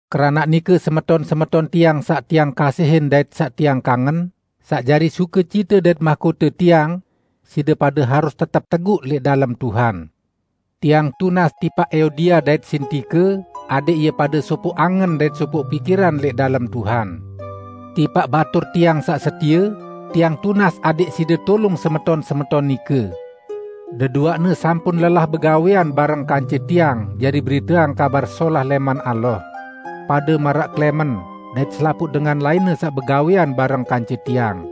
Keranaq nike, semeton-semeton tiang saq tiang kasihin dait saq tiang kangen, saq jari sukecite dait mahkote tiang, side pade harus tetep teguq lẽq dalem Tuhan! Tiang tunas tipaq Euodia dait Sintike adẽq ie pade sopoq angen dait sopoq pikiran lẽq dalem Tuhan. Tipaq batur tiang saq setie, tiang tunas adẽq side tulung semeton-semeton nike. Deduaqne sampun lelah begawẽan bareng kance tiang jari beriteang Kabar Solah lẽman Allah; pade maraq Klẽmen dait selapuq dengan lainne saq begawẽan bareng kance tiang.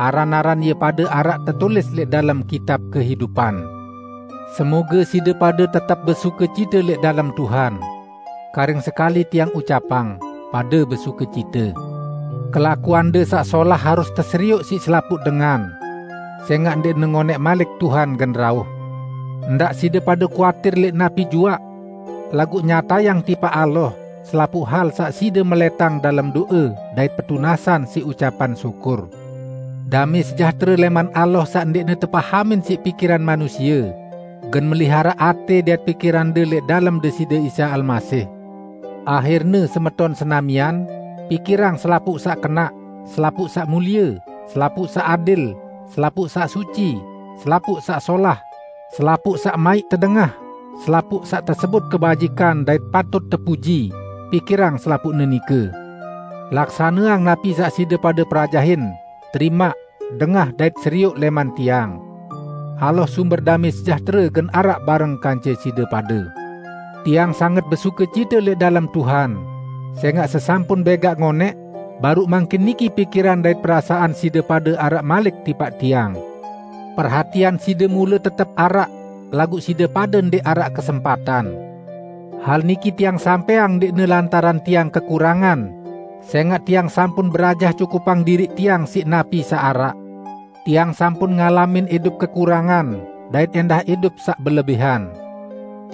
Aran-aran ie pade araq tetulis lẽq dalem Kitab Kehidupan. Semoge side pade tetep besukecite lẽq dalem Tuhan. Karing sekali tiang ucapang: Pade besukecite! Kelakuande saq solah harus teserioq siq selapuq dengan: Sẽngaq ndẽqne ngonẽq malik Tuhan gen rauh. Ndaq side pade kuatir lẽq napi juaq. Laguq nyatayang tipaq Allah selapuq hal saq side melẽtang dalem do'e dait petunasan siq ucapan syukur. Damẽ sejahtere lẽman Allah saq ndẽqne tepahamin siq pikiran manusie, gen meliharaq atẽ dait pikirande lẽq dalem Deside Isa Almasih. Ahirne, semeton senamian, pikirang selapuq saq kenaq, selapuq saq mulie, selapuq saq adil, selapuq saq suci, selapuq saq solah, selapuq saq maiq tedengah, selapuq saq tesebut kebajikan dait patut tepuji, pikirang selapuqne nike. Laksaneang napi saq side pade perajahin, terimaq, dengah dait serioq lẽman tiang. Allah sumber damẽ sejahtere, gen araq bareng kance side pade. Tiang sanget besukecite lẽq dalem Tuhan, sẽngaq sesampun bẽgaq ngonẽq, baruq mangkin niki pikiran dait perasaan side pade araq malik tipaq tiang. Perhatian side mule tetep araq, laguq side pade ndẽq araq kesempatan. Hal niki tiang sampẽang ndẽqne lantaran tiang kekurangan, sẽngaq tiang sampun berajah cukupang diriq tiang siq napi saq araq. Tiang sampun ngalamin idup kekurangan, dait ẽndah idup saq belebihan.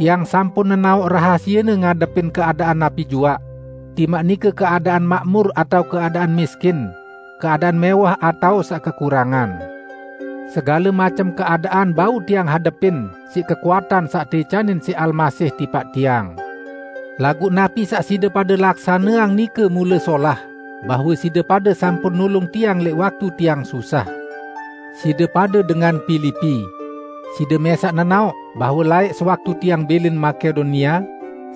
Tiang sampun nenaoq rahasiene ngadepin keadaan napi juaq; timaq nike keadaan makmur atao keadaan miskin, keadaan mẽwah atao saq kekurangan. Segale macem keadaan bau tiang hadepin siq kekuatan saq teicanin siq Almasih tipaq tiang. Laguq napi saq side pade laksaneang nike mule solah, bahwe side pade sampun nulung tiang lẽq waktu tiang susah. Side pade dengan Pilipi! Side mẽsaq nenaoq bahwe laẽq sewaktu tiang bilin Makedonia,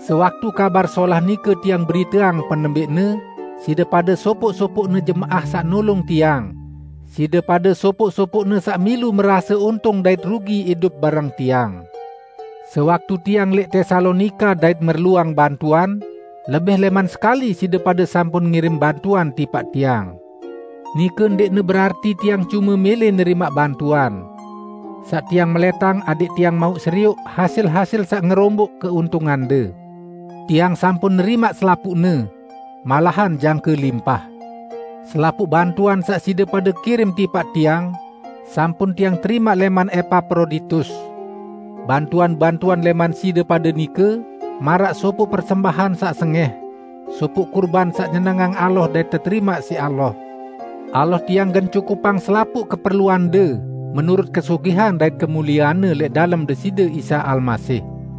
sewaktu Kabar Solah nike tiang beriteang penembẽqne, side pade sopoq-sopoqne jemaah saq nulung tiang; side pade sopoq-sopoqne saq milu merase untung dait rugi idup bareng tiang. Sewaktu tiang lẽq Tesalonika dait merluang bantuan, lebih lẽman sekali side pade sampun ngirim bantuan tipaq tiang. Nike ndẽqne berarti tiang cume mẽlẽ nerimaq bantuan. Saq tiang melẽtang adẽq tiang mauq serioq hasil-hasil saq ngeromboq keuntungande. Tiang sampun nerimaq selapuqne -- malahan jangke limpah! Selapuq bantuan saq side pade kirim tipaq tiang, sampun tiang terimaq lẽman Epaproditus. Bantuan-bantuan lẽman side pade nike maraq sopoq persembahan saq sengẽh, sopoq kurban saq nyenengang Allah dait teterimaq siq Allah. Allah tiang gen cukupang selapuq keperluande menurut kesugihan dait kemuliean-Ne lẽq dalem Deside Isa Almasih.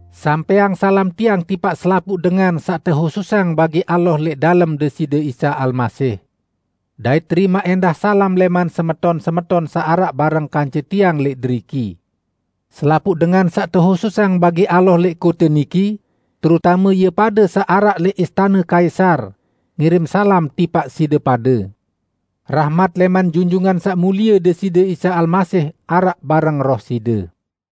Sampẽang salam tiang tipaq selapuq dengan saq tehususang bagi Allah lẽq dalem Deside Isa Almasih. Dait terimaq ẽndah salam lẽman semeton-semeton saq araq bareng kance tiang lẽq deriki. Selapuq dengan saq tehususang bagi Allah lẽq kote niki, terutame ie pade saq araq lẽq istane Kaisar, ngirim salam tipaq side pade. Rahmat lẽman Junjungan Saq Mulie Deside Isa Almasih araq bareng roh side.